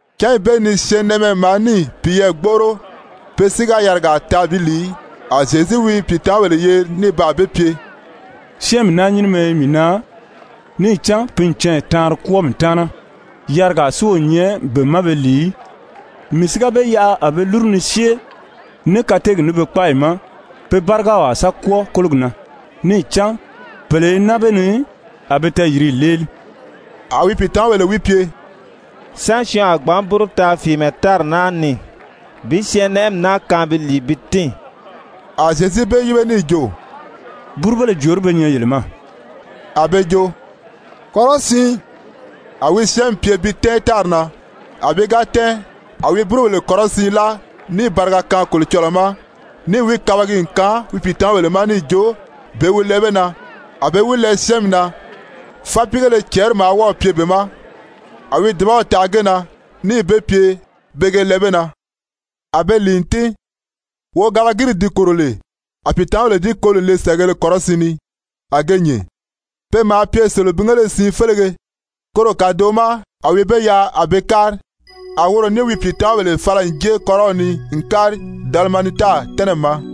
Cányi bee ni syɛɛnnɛʔɛmɛ maa níì piyɛɛ gbóʔoro, pe si ga yarigaa taa bi lìi í, a Zyezu wi pìitamabèle yeri ní baa be pye: «Syɛ́ɛnmi naa nyínimɛ i mii na, níì cán pe n canya taanri kwɔ́ɔ mii taana, yarigaa si o nyɛ be ma be lìi í. Mii si ga be yaʔa a be lúru ni syée ní kateegi ní be kpáayi ma, pe bárigaw a sa kwɔ́ɔ kólogi na, níì cán pèle i naa be ni, a be tɛɛyìriyi léeli.» A wi pìitamabèle wi pye: «Sán syɔɔn a gbǎn búru taa fìímɛ tári naa ni bi syɛ́ɛnmi naa kaan pi lìi bi tín?» A Zyezu be yíbe níì jo: «Búrubéle jòorí be nyɛ yele ma?» A be jo: «Kɔrɔsiin.» A wi syɛ́ɛnmi pye bi tɛ́ɛn tári na, a pi ga tɛ́ɛn, a wi búrubèle kɔrɔsiin láa níì bariga kaan Kolocɔlɔɔ ma, níì wi kabagi n kaan wi pìitamabèle ma níì jo pe wi lɛɛ be na. A be wi lɛɛ syɛ́ɛnmi na. Fápiigéle cɛɛri maa wɔ́ɔ̀ pye be ma, a wi dùbaw taʔa ge na níì be pye pe ge lɛɛ be na. A be lìi n tín, wogabagiri di kòro lè, a pìitamabèle di koli n le sɛ̀ʔɛgēle kɔrɔsiin ni, a ge nyìn. Pe maa pye selebingéle siin félege. Koro kàdoʔo ma a wi be yaʔa a be kári. A woro ní wi pìitamabèle fala n jée kɔ́rɔw ni n kári Dalimanuta tɛ́nɛmi ma.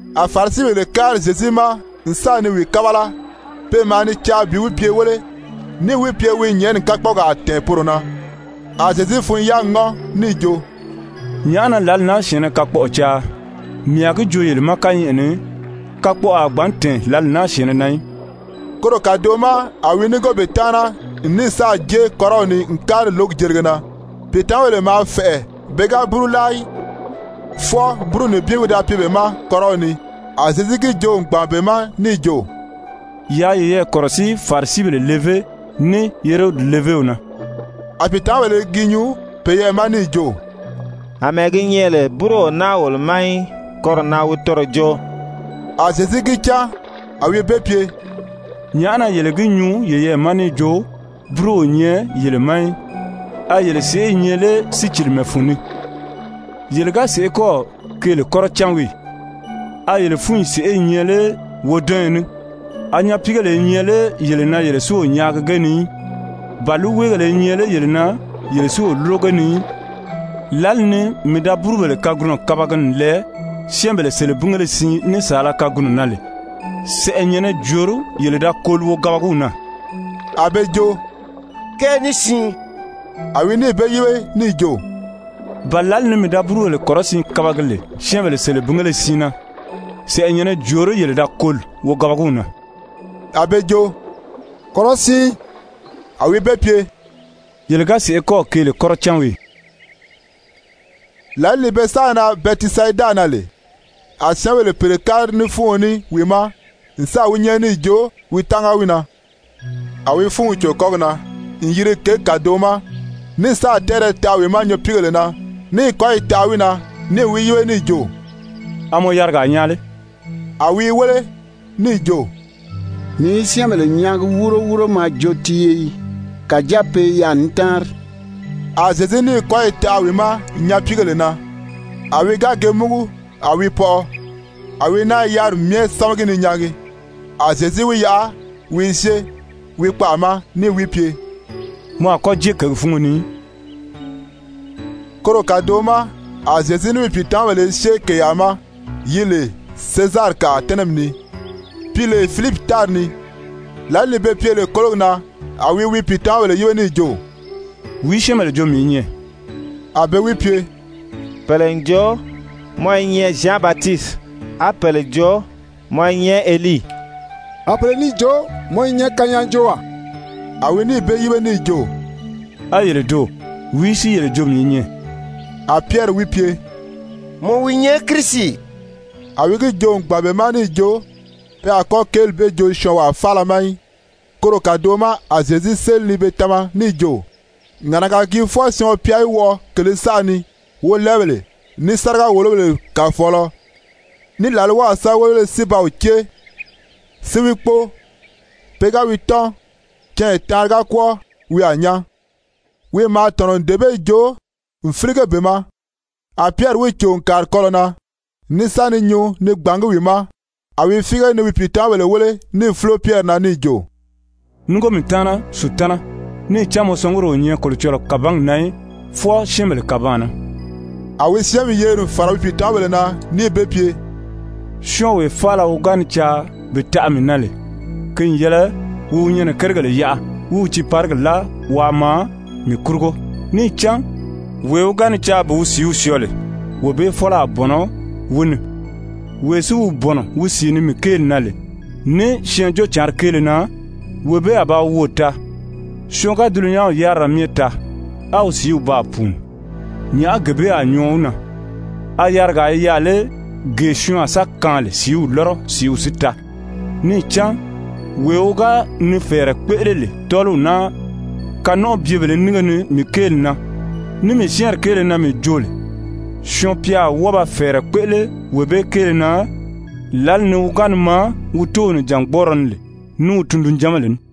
A Farisibèle kári Zyezu ma n sa ni wi kábala, pe maa ni caa bi wi pye wéle, níì wi pye wi nyɛ̀ʔɛni kakpɔɔgaa tɛ̀ɛn poro na. A Zyezu fun-yáagi ŋɔ́n níì jo: «Nyàʔá na lǎli naa syɛ̀ɛnnɛ kakpɔʔɔ caa? Mii a gi joo yele ma kányɛʔɛ ni, kakpɔʔɔ a gbǎn tɛ̀ɛn lǎli naa syɛ̀ɛnnɛ na í.» Koro kàdoʔo ma a wi núngo be taana n ní sáà jée kɔ́rɔw ni n kári lǒgi jelige na. Pìitamabèle maa fɛ̀ʔɛ pe ga búru láa í, fwɔɔ búru nibin wi da pye be ma kɔ́rɔw ni. A Zyezu gi joo n gbàn be ma níì jo: «Yaa yeyɛɛ kɔ̀rɔsíi Farisibèle levé ní Herodi levéw na.» A pìitamabèle i gi nyuu peyɛɛ ma níì jo: «Amɛɛ gi nyɛ lè búru o naa wolo ma í, koro na wi toro joo.» A Zyezu gi cán, a wi be pye: «Nyàʔá na yele gi nyuu yeyɛɛ ma níì jo, búru o nyɛ yele ma í? A yele sèʔé i nyɛ lé sícilimɛ fun ni? Yele ga sèʔé kɔ́ɔ̀ keele kɔ́rɔ cán wii ì? A yele fúnyi sèʔé i nyɛ lé wodɔnyɔ ní? A nyapiigèle i nyɛ lé yele na yele si o nyaagi ge ni í? Ba líiweegèle i nyɛ lé yele na yele si o lúro ge ni í? Lǎli ni mii da búrubèle kagunɔ kabagi n lɛɛ syɛ́ɛnbèle selebingéle siin ní saala kagunɔ na lè, sɛ̀ʔɛnyɛ̀nnɛ jòorí yele da koli wogabagiw na?» A be jo: «Kɛɛ ní siin.» A wi níì be yíbe níì jo: «Ba lǎli ni mii da búrubèle kɔrɔsiin kabagi lè syɛ́ɛnbèle selebingéle siin na, sɛ̀ʔɛnyɛ̀nnɛ jòorí yele da koli wogabagiw na?» A be jo: «Kɔrɔsiin.» A wi be pye: «Yele ga sèʔé kɔ́ɔ̀ keele kɔ́rɔ cán wii ì?» Lǎli ni be sáà nan Bɛtisayida na lè, a syɛ́ɛnbèle pèle kári ní fúuɔn ní wi ma n sáà wi nyɛ́ɛri níì jo wi tánga wi na. A wi fúunw cò kɔ́gi na n yiri kěgi kàdoʔo ma, ní sáà tɛ́ɛrɛ taʔa wi ma nyapiigèle na, níì kɔ́yi taʔa wi na, níì wi yíbe níì jo: «A mɔ yarigaa nyaa lé?» A wi i wéle, níì jo: «Mii i syɛ́ɛnbèle nyaagi wúuro wúuro mɔ a jo tiiye yii, kàjáa pe i yaà ni táanri.» A Zyezu níì kɔ́yi taʔa wi ma nyapiigèle na. A wi ga ge múgu, a wi pɔʔɔ. A wi náa i yáriri myɛ sámagi ni nyaagi. A Zyezu wi yaʔa wi i syée wi kpaʔa ma níì wi pye: «Mɔ a kɔ́ jée kěgi fúngo ni í.» Koro kàdoʔo ma a Zyezu ní wi pìitamabèle i syée kèyaa ma yi lè Sezarikaʔa tɛ́nɛmi ni, pi lè Filipi tári ni. Lǎli ni be pye lè kólogi na, a wi wi pìitamabèle yíbe níì jo: «Wìí syɛ́ɛnbèle jo mii i nyɛ?» A be wi pye: «Pèle n jo mɔ i nyɛ Zyan Batisiti. A pèle jo mɔ i nyɛ Elii. A pèle níì jo mɔ i nyɛ kanyaajoowaa.» A wi níì be yíbe níì jo: «A yele doò, wìí si yele jo mii i nyɛ?» A Pyɛri wi pye: «Mɔ wi nyɛ Kirisi.» A wi gi joo n gbàn be ma níì jo, pe a kɔ́ kéeli bee joo syɔɔnwaa faala ma í. Koro kàdoʔo ma a Zyezu séli ni be tama níì jo: Ŋàʔanaga gii fwɔɔ Syɔɔn-pya í wɔʔɔ kèlē saʔa ni, wolɛɛbèle, ní sáriga-wòlobèle kàfɔɔlɔ ní làlwaw sɛ́bɛwelebéle si ba wi cée, si wi kpóo, pe ga wi tɔ́n, canya taanri ga kwɔ́ɔ, wi a nyán. Wi maa tɔ̀nɔ n dee bee joo n fílige be ma. A Pyɛri wi cò n kàri kɔlɔ̀ na, ní sa ni nyuu ni gbàngí wi ma. A wi fíige ni wi pìitamabèle wéle níì fúlo Pyɛri na níì jo: «Núngo mii taana, Sutana, níì cán mɔ sɔnguri o nyɛ Kolocɔlɔɔ kàbangi na í, fwɔɔ syɛ́ɛnbèle kàbaan na.» A wi syɛ́ɛnmi yeri n fàra wi pìitamabèle na níì be pye: «Syɔ́ɔnwee faala wi ga ni caa bi taʔa mii na lè, ki n yɛlɛ wi wi nyɛnɛ kérigèle yaʔa wí wi tiiparigi láa waa maa mii kurugo. Níì cán wee wi ga ni caa bi wi sìíw syɔɔ lè, wee bee fɔ́lɔ a bɔ̀nɔ wi ni, wee si wi bɔ̀nɔ wi sìi ni mii kéeli na lè, ní Syɛɛnjóocǎnri kéele na, wee bee a ba wi woò taa. Syɔɔn ga dulunyanw yárira myɛ taa, á wi sìíw baa pùuni, nyàʔá gee bee a nyɔɔ wi na? A yarigaa i yaà lé gee syɔɔn a sa kaan lè sìíw lɔ́rɔ sìíw si taa? Níì cán wee wi ga ni fɛ̀ɛrɛ kpéʔele lè tɔ́ɔliw naa kanɔnʔɔbyebèlē nínge ni mii kéeli na, ní mii syɛ́ɛnri kéele na mii joo lè, Syɔɔn-pya a wɔ́ɔ ba fɛ̀ɛrɛ kpéʔele wee bee kéele na lǎli ni wi ga ni maa wi Tóow nìjangbɔɔrɔ ni lè ní wi tundunjanbèle ní.»